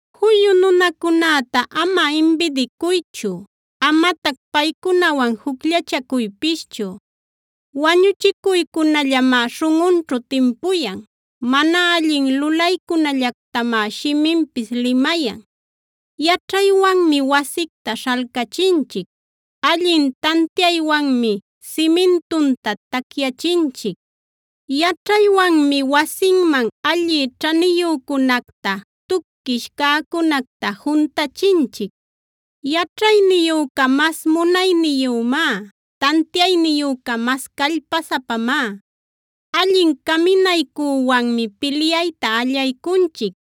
Juyu nunacunäta ama imbidicuychu; amatac paycunawan jucllachacuypischu. Wañuchicuycunallamá śhunꞌunćhu timpuyan; mana allin lulaycunallactamá shiminpis limayan. Yaćhaywanmi wasicta śhalcachinchic; allin tantiaywanmi simintunta tacyachinchic. Yaćhaywanmi wasinman alli ćhaniyücunacta, tuquish cäcunacta juntachinchic. Yaćhayniyüca mas munayniyümá; tantiayniyüca mas callpasapamá. Allin caminaycüwanmi pilyayta allaycunchic;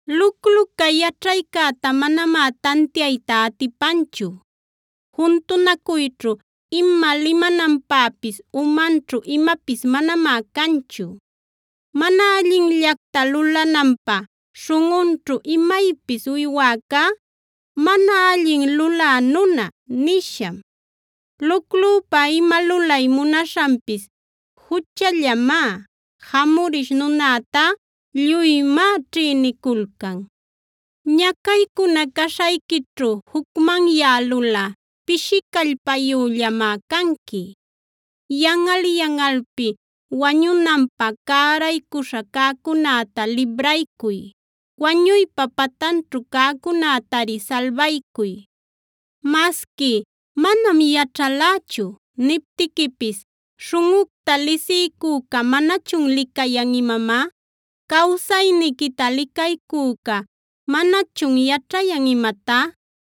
Lucluca yaćhaycäta manamá tantiayta atipanchu; juntunacuyćhu ima limananpäpis umanćhu imapis manamá canchu. Mana allinllacta lulananpä śhunꞌunćhu imaypis uywäcá “Mana allin lulä nuna” nisham. Luclüpa ima lulay munaśhanpis juchallamá; jamurish nunätá lluymá ćhïniculcan. Ñacaycuna caśhayquićhu jucmanyälulꞌa pishi callpayüllamá canqui. Yanꞌal-yanꞌalpi wañunanpä cäraycuśha cäcunäta libraycuy; wañuypa patanćhu cäcunätari salbaycuy. Masqui “manam yaćhalächu” niptiquipis, ¿śhunꞌucta lisiycüca manachun licayan imamá? ¿Cawsayniquita licaycüca manachun yaćhayan imatá?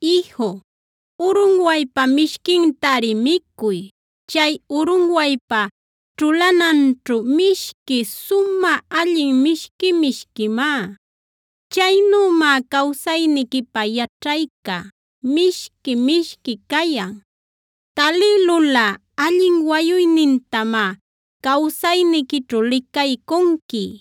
Iju, urunwaypa mishquintari micuy; chay urunwaypa ćhulananćhu mishquin sumä allin mishqui-mishquimá. Chaynümá cawsayniquipä yaćhayca mishqui-mishqui cayan. Talïlulꞌa allin wayuynintamá cawsayniquićhu licaycunqui;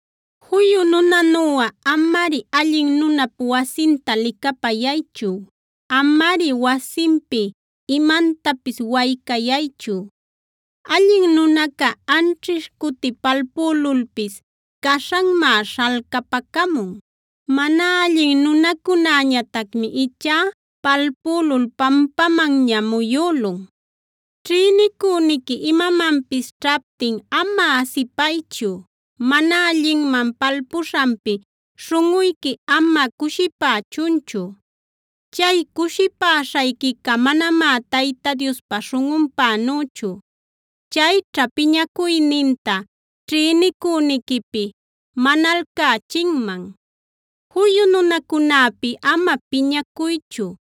Juyu nunanuꞌa, amari allin nunap wasinta licapayaychu; amari wasinpi imantapis waycayaychu. Allin nunaca anćhish cuti palpülulpis caśhanmá śhalcapacamun; mana allin nunacunäñatacmi ichá palpülul pampamanña muyülun. Ćhïnicüniqui imamanpis ćhaptin ama asipaychu; mana allinman palpuśhanpi śhunꞌuyqui ama cushipächunchu. Chay cushipäśhayquica manamá Tayta Diospa śhunꞌunpänüchu; chayćha piñacuyninta ćhïnicüniquipi manalcächinman. Juyu nunacunäpi ama piñacuychu;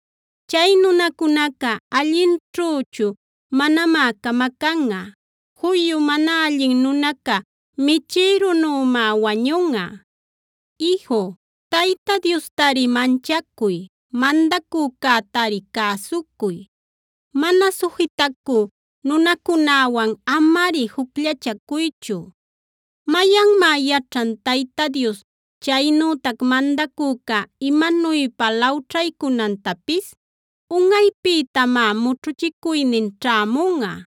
Chay nunacunaca allinćhüchu manamá camacanꞌa; juyu mana allin nunaca michïrunümá wañunꞌa. Iju, Tayta Diostari manchacuy, mandacücätari cäsucuy; mana sujitacü nunacunäwan amari jucllachacuychu. ¿Mayanmá yaćhan Tayta Dios chaynütac mandacüca imanuypa lawćhaycunantapis? Unꞌaypïtamá mućhuchicuynin ćhämunꞌa.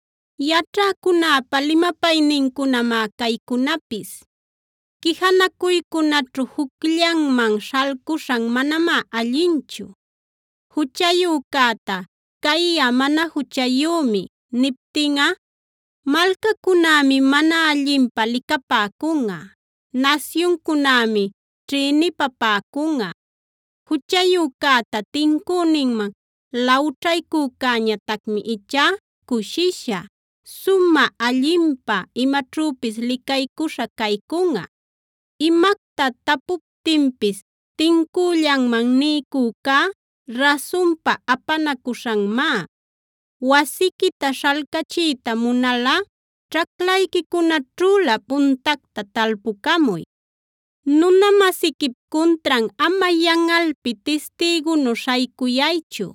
Yaćhäcunäpa limapaynincunamá caycunapis: Quijanacuycunaćhu jucllanman śhalcuśhan manamá allinchu. Juchayücäta: “Cayꞌa mana juchayümi” niptinꞌa, malcacunämi mana allinpä licapäcunꞌa, nasyuncunämi ćhïnipapäcunꞌa. Juchayücäta tincüninman lawćhaycücäñatacmi ichá cushisha, sumä allinpä imaćhüpis licaycuśha caycunꞌa. Imacta tapuptinpis tincüllanman niycücá rasunpa apanacuśhanmá. Wasiquita śhalcachiyta munalꞌa ćhaclayquicunaćhülä puntacta talpucamuy. Nuna-masiquip cuntran ama yanꞌalpi tistïgunu śhaycuyaychu;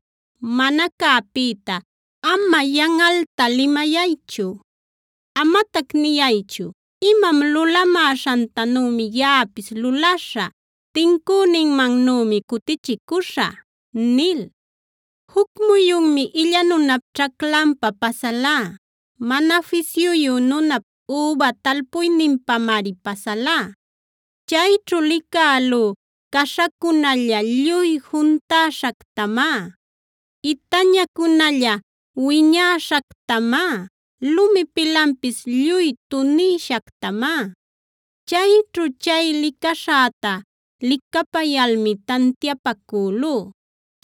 mana cäpïta ama yanꞌalta limayaychu. Amatac niyaychu: “Imam lulamäśhantanümi yaꞌapis luläśhä; tincüninmannümi cutichicüśhä” nil. Juc muyunmi illa nunap ćhaclanpa pasalá; mana fisyuyu nunap üba talpuyninpamari pasalá. Chayćhu licälú caśhacunalla lluy juntäśhactamá, itañacunalla wiñäśhactamá, lumi pilanpis lluy tunïshactamá. Chayćhu chay licaśhäta licapayalmi tantiapacülú.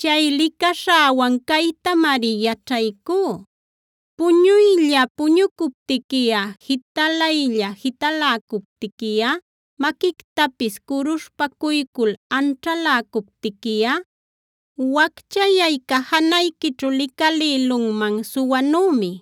Chay licaśhäwan caytamari yaćhaycú: Puñuylla puñucuptiquiꞌa, jitalaylla jitaläcuptiquiꞌa, maquictapis curuśhpacuycul anćhaläcuptiquiꞌa, wacchayayca janayquićhu licalïlunman suwanümi,